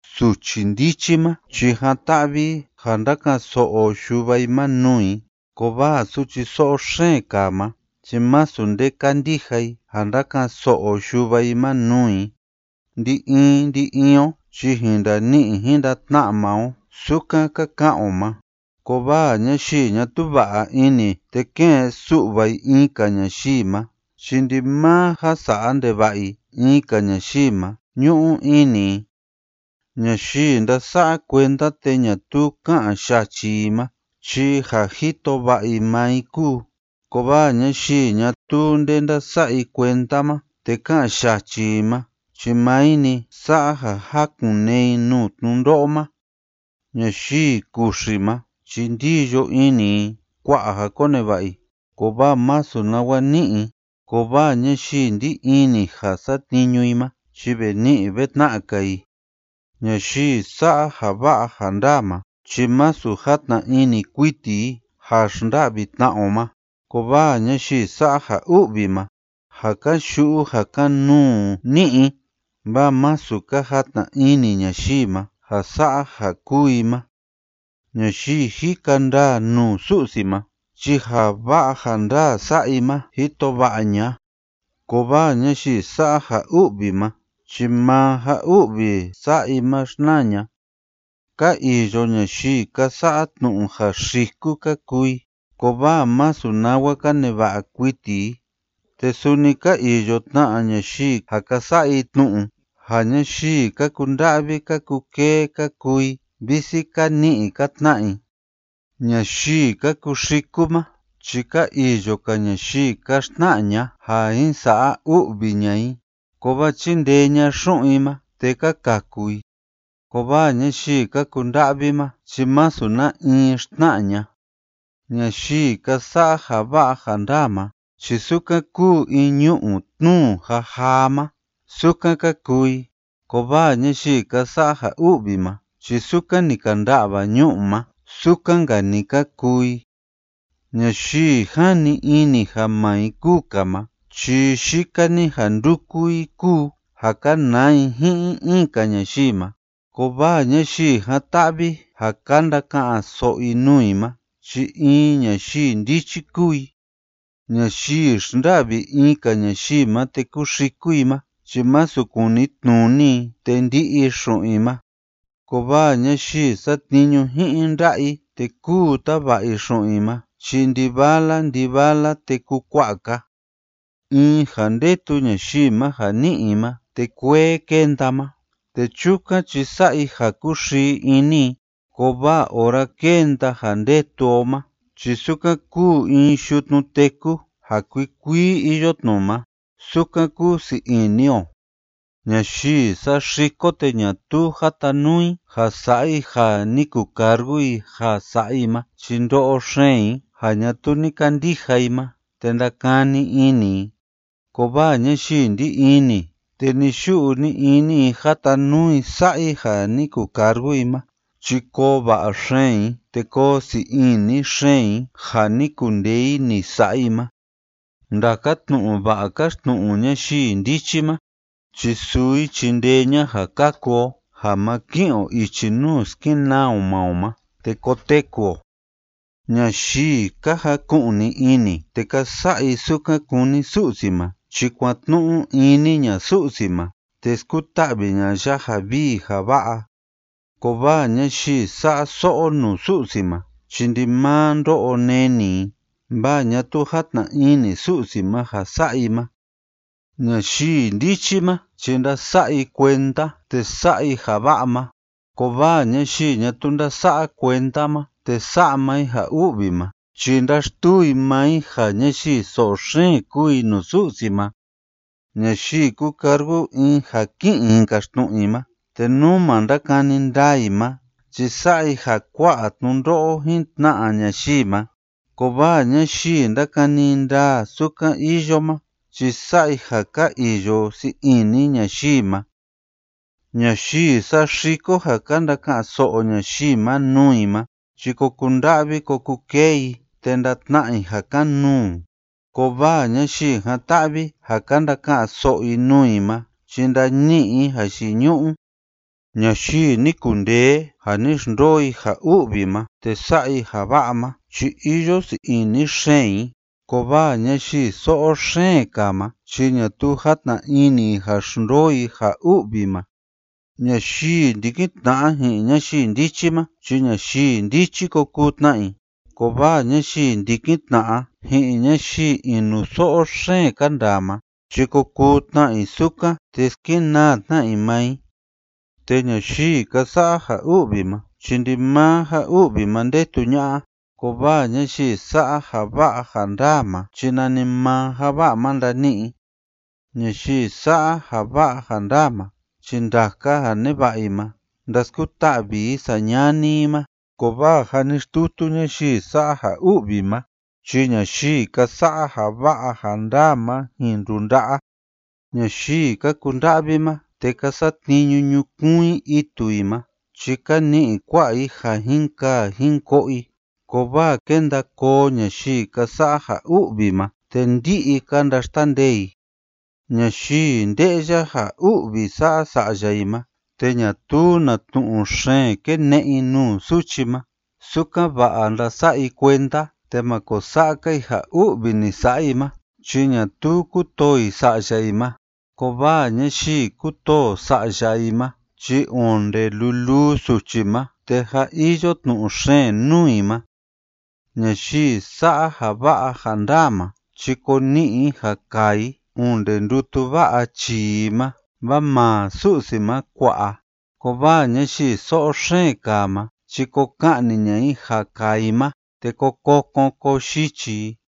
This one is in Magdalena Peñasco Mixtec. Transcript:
Suchi ndichi ma chi jan‑ta'vi i ja ndáka'an so'o yuva i ma nuu i, kovaa suchi so'o xeen kaa ma chi masu nde kándija i ja ndáka'an so'o yuva i ma nuu i. Ndi‑in ndi‑in o chi jin ndani'i jin ndatna'a maa o sukan ka ka'an o ma, kovaa ñayii ñatuu va'a ini te ke'en su'va i in‑ka ñayii ma chi ndimaa ja sa'a ndeva'a i in‑ka ñayii ma ñu'u ini i. Ñayii ndása'a kuenda te ñatuu ká'an yachi i ma chi ja jito va'a i maa i kúu, kovaa ñayii ñatuu nde ndása'a i kuenda ma te ká'an yachi i ma chi maa i‑ni sa'a ja jákun‑nee i nuu tnundo'o ma. Ñayii kuxi ma chi ndíyo ini i kua'a ja koneva'a i kovaa masu nawa ni'i i, kovaa ñayii ndí ini ja satniñu i ma chi ve ni'i ve tna'a‑ka i. Ñayii sa'a ja va'a ja ndaa ma chi masu játna ini kuiti i ja xnda'vi tna'a o ma, kovaa ñayii sa'a ja u'vi ma, ja kan‑yu'u ja kan‑nuu ni'i i, vaa masu ka jatna ini ñayii ma ja sa'a ja kúu i ma. Ñayii jika ndaa nuu Su'si ma chi ja va'a ja ndaa sa'a i ma jito va'a ña'a, kovaa ñayii sa'a ja u'vi ma chi maa ja u'vi sa'a i ma xnaa ña'a. Ka iyo ñayii ka sa'a tnu'u ja xiku ka kuu i kovaa masu nawa ka neva'a kuiti i, te suni ka iyo tna ñayii ja ka sa'a i tnu'u ja ñayii ka kunda'vi ka kukee ka kuu i, visi ka ni'i ka tna'a i. Ñayii ka kuxiku ma chi ka iyo‑ka ñayii ka xtna'a ña'a ja jin sa'a u'vi ña'a i, kovaa chíndee ña'a xu'un i ma te ka kaku i. Kovaa ñayii ka kunda'vi ma chi masu na in xtna'a ña'a. Ñayii ka sa'a ja va'a ja ndaa ma chi sukan kúu in ñu'u tnúu jajaa ma, sukan ka kuu i, kovaa ñayii ka sa'a ja u'vi ma chi sukan ni ka nda'va ñu'u ma, sukan‑nka‑ni ka kuu i. Ñayii jani ini ja maa i kúu‑ka ma chi yika‑ni ja ndúku i kúu ja kanaa i ji'in in‑ka ñayii ma, kovaa ñayii jan‑ta'vi ja ka ndaka'an so'o i nuu i ma chi in ñayii ndichi kúu i. Ñayii xnda'vi in‑ka ñayii ma te kúxiku i ma chi masu kunitnuni i te ndi'i xu'un i ma, kovaa ñayii satniñu ji'in nda'a i te kúu tava'a i xu'un i ma chi ndi‑vala ndi‑vala te kukua'a‑ka. In ja ndetu ñayii ma ja ni'i i ma te kuee kénda ma, te chukan chi sa'a i ja kúxii ini i, kovaa ora kénda ja ndetu o ma chi sukan kúu in yutnu téku ja kuikuii iyo tnu ma sukan kúsii ini o. Ñayii saxiko te ñatuu jatanuu i ja sa'a i ja ni kucargu i ja sa'a i ma chi ndo'o xeen i ja ñatuu ni kandija i ma te ndakani ini i, kovaa ñayii ndí ini te ni‑yu'u ni‑ini i jatanuu i sa'a i ja ni kucargu i ma chi koo va'a xeen i te koo sii ini xeen i ja ni kundee i ni sa'a i ma. Ndaka tnu'u va'a káxtnu'u ñayii ndichi ma chi suu i chindee ña'a ja kaku o ja ma ki'in o ichi nuu skenaa o maa o ma, te koteku o. Ñayii ka jaku'ni ini te ka sa'a i sukan kúni Su'si ma chi kuatnu'u ini ña'a Su'si ma te skuta'vi ña'a ya ja vii ja va'a, kovaa ñayii sa'a so'o nuu Su'si ma chi ndimaa ndo'o neni i, vaa ñatuu játna ini Su'si ma ja sa'a i ma. Ñayii ndichi ma chi ndása'a i kuenda te sa'a i ja va'a ma, kovaa ñayii ñatuu ndása'a kuenda ma te sa'a maa i ja u'vi ma chi ndáxtuu i maa i ja ñayii so'o xeen kúu i nuu Su'si ma. Ñayii kúcargu in ja ki'in i jin kaxtnu'u i ma te nú ma ndakani ndaa i ma chi sa'a i ja kua'a tnundo'o jin tna'a ñayii ma, kovaa ñayii ndákani ndaa sukan iyo ma chi sa'a i ja ka iyo sii ini ñayii ma. Ñayii saxiko ja ka ndaka'an so'o ñayii ma nuu i ma chi ko kunda'vi ko kukee i te ndatna'a i ja kan‑nuu, kovaa ñayii jan‑ta'vi ja ka ndaka'an so'o i nuu i ma chi ndani'i i jayiñu'u. Ñayii ni kundee ja ni xndoo i ja u'vi ma te sa'a i ja va'a ma chi iyo sii ini xeen i, kovaa ñayii so'o xeen kaa ma chi ñatuu játna ini i ja xndoo i ja u'vi ma. Ñayii ndikin tna'a ji'in ñayii ndichi ma chi ñayii ndichi ko kuu tna i, kovaa ñayii ndikin tna'a ji'in ñayii inuso'o xeen ka ndaa ma chi ko kuu tna i sukan te skenaa tna i maa i. Te ñayii ka sa'a ja u'vi ma chi ndimaa ja u'vi ma ndetu ña'a, kovaa ñayii sa'a ja va'a ja ndaa ma chi nanimaa ja va'a ma ndani'i i. Ñayii sa'a ja va'a ja ndaa ma chi ndaka ja neva'a i ma ndaskuta'vi i sañani i ma, kovaa ja ni xtutu ñayii sa'a ja u'vi ma chi ñayii ka sa'a ja va'a ja ndaa ma jin ndunda'a. Ñayii ka kunda'vi ma te ka satniñu ñukuun i itu i ma chi ka ni'i kua'a i ja jin kaa jin ko'o i, kovaa kénda koo ñayii ka sa'a ja u'vi ma, te ndi'i ka ndaxtandee i. Ñayii nde'ya ja u'vi sa'a sa'ya i ma te ñatuu na tnu'u xeen kéne'e i nuu suchi ma, sukan‑va'a ndasa'a i kuenda te ma ko sa'a‑ka i ja u'vi ni sa'a i ma chi ñatuu kútoo i sa'ya i ma, kovaa ñayii kútoo sa'ya i ma chi onde luluu suchi ma te jâ iyo tnu'u xeen nuu i ma. Ñayii sa'a ja va'a ja ndaa ma chi ko ni'i i ja kaa i onde ndutu va'a chii i ma, vaa maa Su'si ma kua'a, kovaa ñayii so'o xeen kaa ma chi ko ka'ni ña'a i ja kaa i ma te ko kokon ko yichi i.